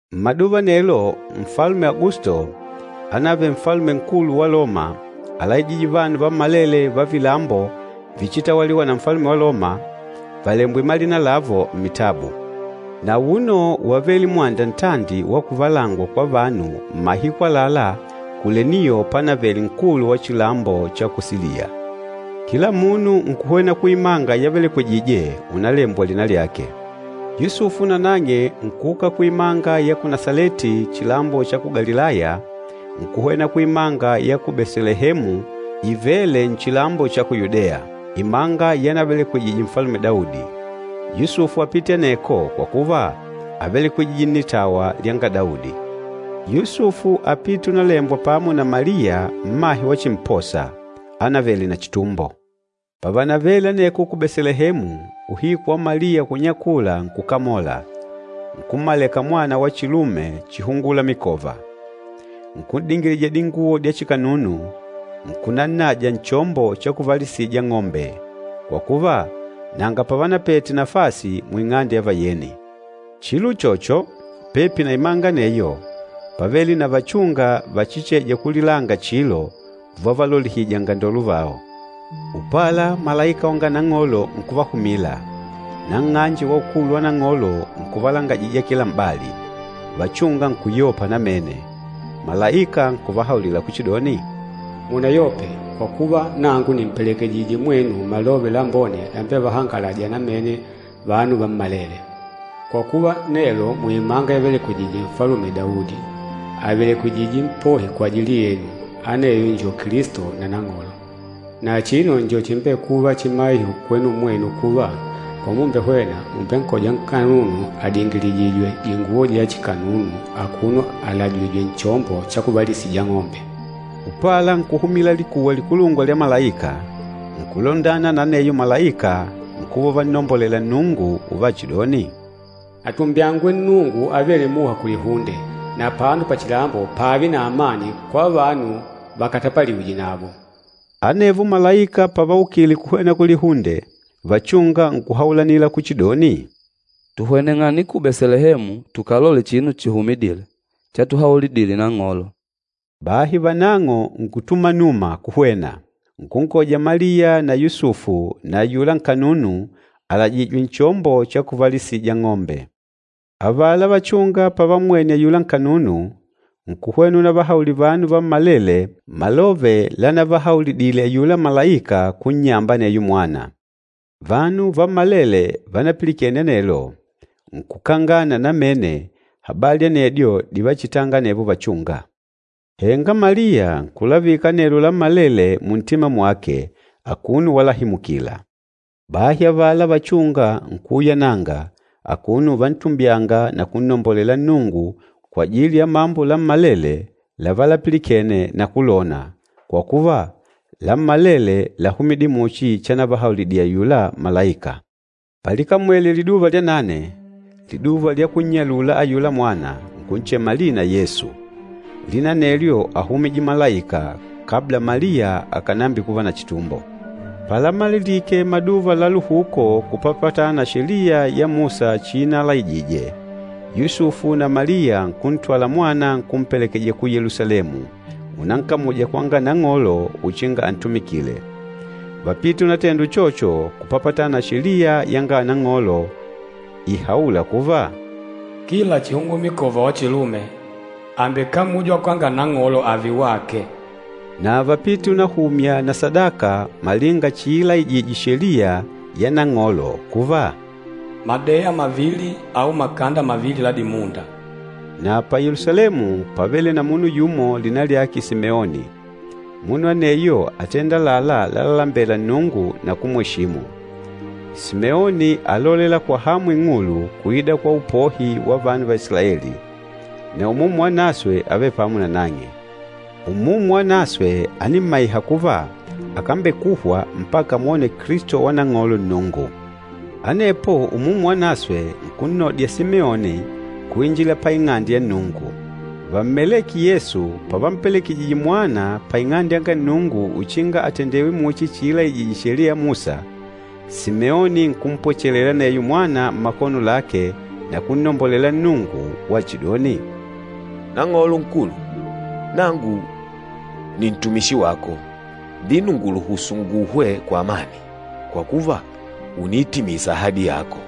Mmaduva anelo, Nfalume Agusto, ánavele nfalume nkulu wa Loma, álaijije vanu vammalele va vilambo víchitawaliwa na ufalume wa Loma, valembwe malina lavo mmitabu. Na auno wávele mwanda ntandi wa kuvalangwa kwa vanu mmahiku àlalá Kuleniyo panavele nkulu wa chilambo cha ku Siliya. Kila munu nkuhwena kuimanga yavelekwejije unalembwa lina lyake. Yusufu nanang'e nkuuka kuimanga ya ku Nasaleti chilambo cha ku Galilaya, nkuhwena kuimanga ya ku Betelehemu ivêle nchilambo cha ku Yudeya, imanga yanavelekwejije Nfalume Daudi. Yusufu ápite aneko kwa kuva, ávelekwejije nnitawa lyanga Daudi. Yusufu ápite unalembwa pamo na Maliya mmahe wachimposa, ánavele na chitumbo. Pavanavele aneko ku Betelehemu, uhiku wa Maliya kunyakula nkukamola, nkummaleka mwana wa chilume, chihungumikova. Nkun'dingilija dinguwo dya chikanunu, nkunannaja nchombo cha kuvalisija ang'ombe, kwa kuva, nanga pavanapete nafasi muing'ande ya vayeni. Chilo uchocho, pepi na imanga aneyo pávele na vachúnga vachicheja kulilanga chilo uvavalolihija angandolo vao. Upala malaika wanga Nang'olo nkuvahumila, na nng'anje wa ukulu wa Nang'olo nkuvalangajija kila m'bali, vachúnga nkuyopa namene. Malaika nkuvahaulila kuchidoni, “Munayope, kwa kuva, nangu nìmpelekejijije mwenu malove lambone lambevahangalâja namene vanu vammalele. Kwa kuva, nelo muimanga yavelekwejije Nfalume Daudi, àvelekwejije Mpohi kwajili yenu, aneyo njo Kilisto na Nang'olo. Na achino njo chimbekûva chimaiho kwenu mwenu kuva, pamumbehwena mùmbenkoja nkanunu adingilijìjwè dinguwo dya chikanunu akuno alajìjwè nchombo cha kuvalisija ang'ombe.” Upala nkuhumila likuwa likulungwa lya malaika, nkulundana na aneyo malaika, nkuva uvannombolela Nnungu uvachidoni, “Atumbyangwe Nnungu avêle muha kulihunde, na apano pachilambo pààve na amani kwa vanu vákatapaliwìjè navo!” Anevo malaika pavaukile kuhwena kulihunde, vachúnga nkuhaulanila kuchidoni, “Tuhweneng'ane ku Betelehemu tukalole chinu chihumidîle, chatuhaulidile Nang'olo.” Bahi vanang'o nkutumanuma kuhwena, nkunkoja Maliya na Yusufu na ayula nkanunu, alajìjwè nchombo cha kuvalisija ang'ombe. Avala vachúnga pavammwene ayula nkanunu, nkuhwena unavahaulila vanu vammalele malove lanavahaulidile ayula malaika kunnyamba aneyo mwana. Vanu vammalele vanapilikene anelo, nkukangana namene habali anedyo divachitanga anevo vachúnga. Henga Maliya nkulavika anelo lammalele muntima mwake akuno walahimukila. Bahi avala vachúnga nkuuyananga, akuno uvantumbyanga na kunnombolela Nnungu kwajili ya mambo lammalele lavalapilikene na kulona, kwa kuva, lammalele láhumidile muchi chanavahaulidile ayula malaika. Palikamwele liduva lya nane, liduva lya kunnyalula ayula mwana, nkunchema lina Yesu. Lina anelyo áhumije malaika kabla Maliya akànambikuva na chitumbo. Palamalilike maduva la luhuko kupapatana na Sheliya ya Musa chiinalaijije, Yusufu na Maliya nkuntwala mwana nkumpelekeja ku Yelusalemu, unankamuja kwanga Nang'olo uchinga antumikile. Vápite unatenda uchocho kupapatana na Sheliya yanga Nang'olo ihaûla kuva, “Kila chihungumikova wa chilume, àmbekamujwa kwanga Nang'olo ààve wake.” Na vápite unahumya na sadaka malinga chiilaijije Sheliya ya Nang'olo kuva, “madeya mavili au makanda mavili la dimunda.” Na pa Yelusalemu pávele na munu yumo lina lyake Simeoni. Munu aneyo átenda àlalá lalalembela Nnungu na kumweshimu. Simeoni álolela kwa hamu ing'ulu kuida kwa upohi wa vanu va Isilaeli, na Umumu Wanaswe ávele pamo nanang'e. Umumu Wanaswe ánimmaiha kuva, akambekuhwa mpaka amwone Kilisto wa Nang'olo Nnungu. Anepo Umumu Wanaswe nkunnodya Simeoni kuinjila pa Ing'ande ya Nnungu. Vammelêke Yesu pavampelekejije mwana pa Ing'ande yanga Nnungu uchinga atendewe muchi chiilaijije Sheliya ya Musa, Simeoni nkumpwechelela aneyo mwana mmakono lake na kunnombolela Nnungu, wachidoni, “Nang'olo Nkulu, nangu ni ntumishi wako, na vino ùnguluhusu kuhwa kwa amani, kwa kuva, ùniitimisa ahadi yako.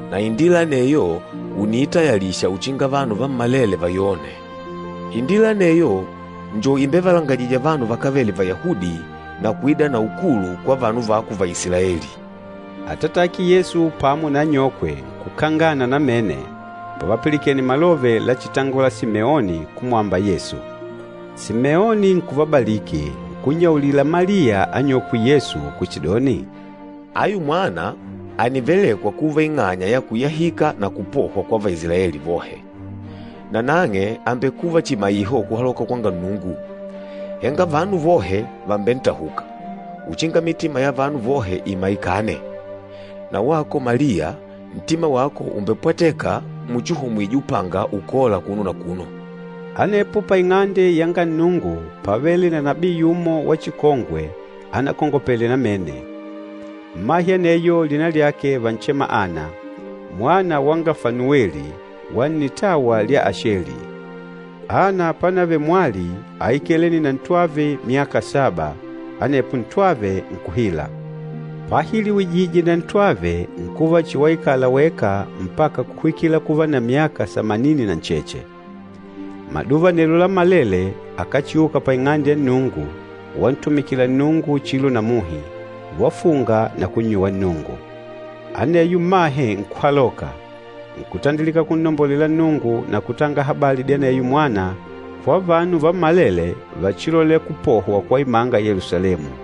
Na upohi anewo ùniutayalisha na vanu vammalele vachivawone. Upohi anewo njo umbevalangajîja vanu vakávele Vayahudi, na kuida na ukulu kwa vanu vako Vaisilaeli.” Atatake Yesu pamo na anyokwe nkukangana namene pavapilikene malove lachitangola Simeoni kumwamba Yesu. Simeoni nkuvabaliki, nkunnyaulila Maliya anyokwe Yesu kuchidoni, “Ayu mwana ànivelekwa kuva ing'anya ya kuyahika na kupohwa kwa Vaisilaeli vohe. Na nang'e àmbekuva chimaiho kuhaloka kwanga Nnungu, henga vanu vohe vàmbentahuka, uchinga mitima ya vanu vohe imaikane. Na wako Maliya ntima wako ùmbepwateka muchi ùhomwije upanga ukôla akuno na akuno.” Anepo pa Ing'ande yanga Nnungu pávele na nabii yumo wa chikongwe anakongopele namene. Mmahe aneyo lina lyake vánchema Ana, mwana wanga Fanuweli, wa nnitawa lwa Asheli. Ana pánavele mwali áikalene na ntwave myaka saba, anepo ntwave nkuhila. Pahiliwijije na ntwave nkuva chihi waikala weka mpaka kuhwikila kuva na myaka samanini na ncheche. Maduva anelo lammalele akáchiuka pa Ing'ande ya Nnungu wantumikila Nnungu chilo na muhi, wafunga na kunnyuwa Nnungu. Aneyo mmahe nkuhaloka, nkutandilika kunnombolela Nnungu na kutanga habali dya aneyo mwana kwa vanu vammalele vachilolêla kupohwa kwa imanga ya Yelusalemu.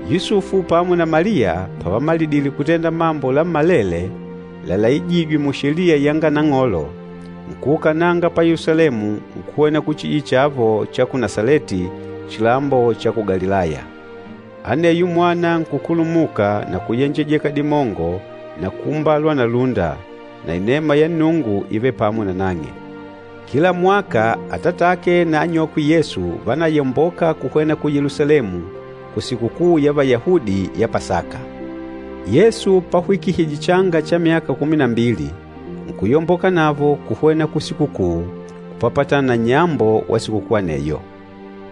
Yusufu pamo na Maliya, pavamalidile kutenda mambo lammalele lalaijîjwe mu Sheliya yanga Nang'olo, nkuukananga pa Yelusalemu nkuhwena kuchijiji chavo cha ku Nasaleti, chilambo cha ku Galilaya. Aneyo mwana nkukulumuka na kuyenjejeka dimongo na kuumbalwa na lúnda, na inema ya Nnungu ívele pamo nanang'e. Kila mwaka atatake na anyokwe Yesu vánayomboka kuhwena ku Yelusalemu kusikukuu ya Vayahudi ya Pasaka. Yesu pahwikihije changa cha myaka kumi na mbili, nkuyomboka navo kuhwena kusikukuu kupapatana na nnyambo wa sikukuu aneyo.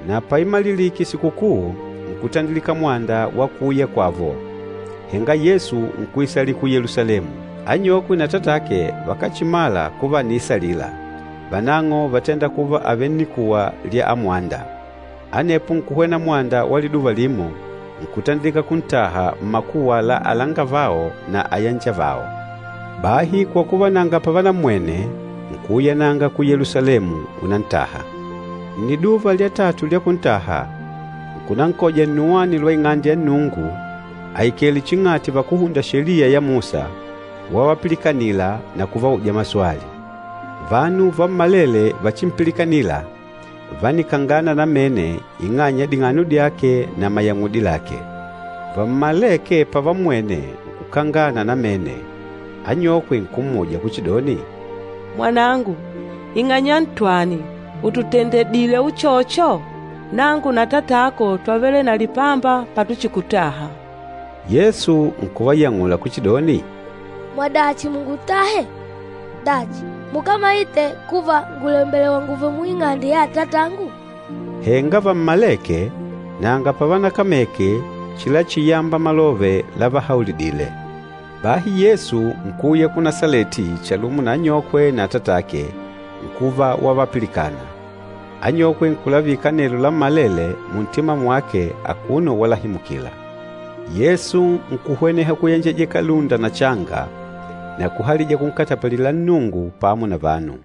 Na paimalilike sikukuu, nkutandilika mwanda wa kuuya kwavo, henga Yesu nkuisalila ku Yelusalemu. Anyokwe na atatake vakáchimala kuva àniisalila, vanang'o vátenda kuva àvele nnikuwa lya amwanda. Anepo nkuhwena mwanda wa liduva limo, nkutandilika kuntaha mmakuwa la alangavao na ayanjavao. Bahi kwa kuva nanga pavanammwene, nkuuyananga ku Yelusalemu unantaha. Nniduva lya tatu lya kuntaha, nkunankoja nnuwani lwa Ing'ande ya Nnungu aikèlè ching'ati vakúhunda Sheliya ya Musa, wavapilikanila na kuvauja maswali. Vanu vammalele vachimpilikanîla vánikangana namene ing'anya ya ding'ano dyake na mayang'udi lake. Vammalêke pavammwene nkukangana namene. Anyokwe nkummuja kuchidoni, “Mwanangu, ing'anya ntwani ùtutendedile uchocho? Nangu na atatako twavele na lipamba patuchikutaha.” Yesu nkuvayang'ula kuchidoni, “Múngutahija chani? Dachi, mukámayite kuva ngùlembelewa ngùùve mu Ing'ande mwa Atatangu?” Henga vammalêke, nanga pavanakameke chilachiyamba malove lavahaulidile. Bahi Yesu nkuuya ku Nasaleti chalumo na anyokwe na atatake, nkuva wavapilikana. Anyokwe nkulavika anelo lammalele muntima mwake akuno walahimukila. Yesu nkuhweneha kuyenjejeka lúnda na changa, na kuhalija kunkatapalila Nnungu pamo na vanu.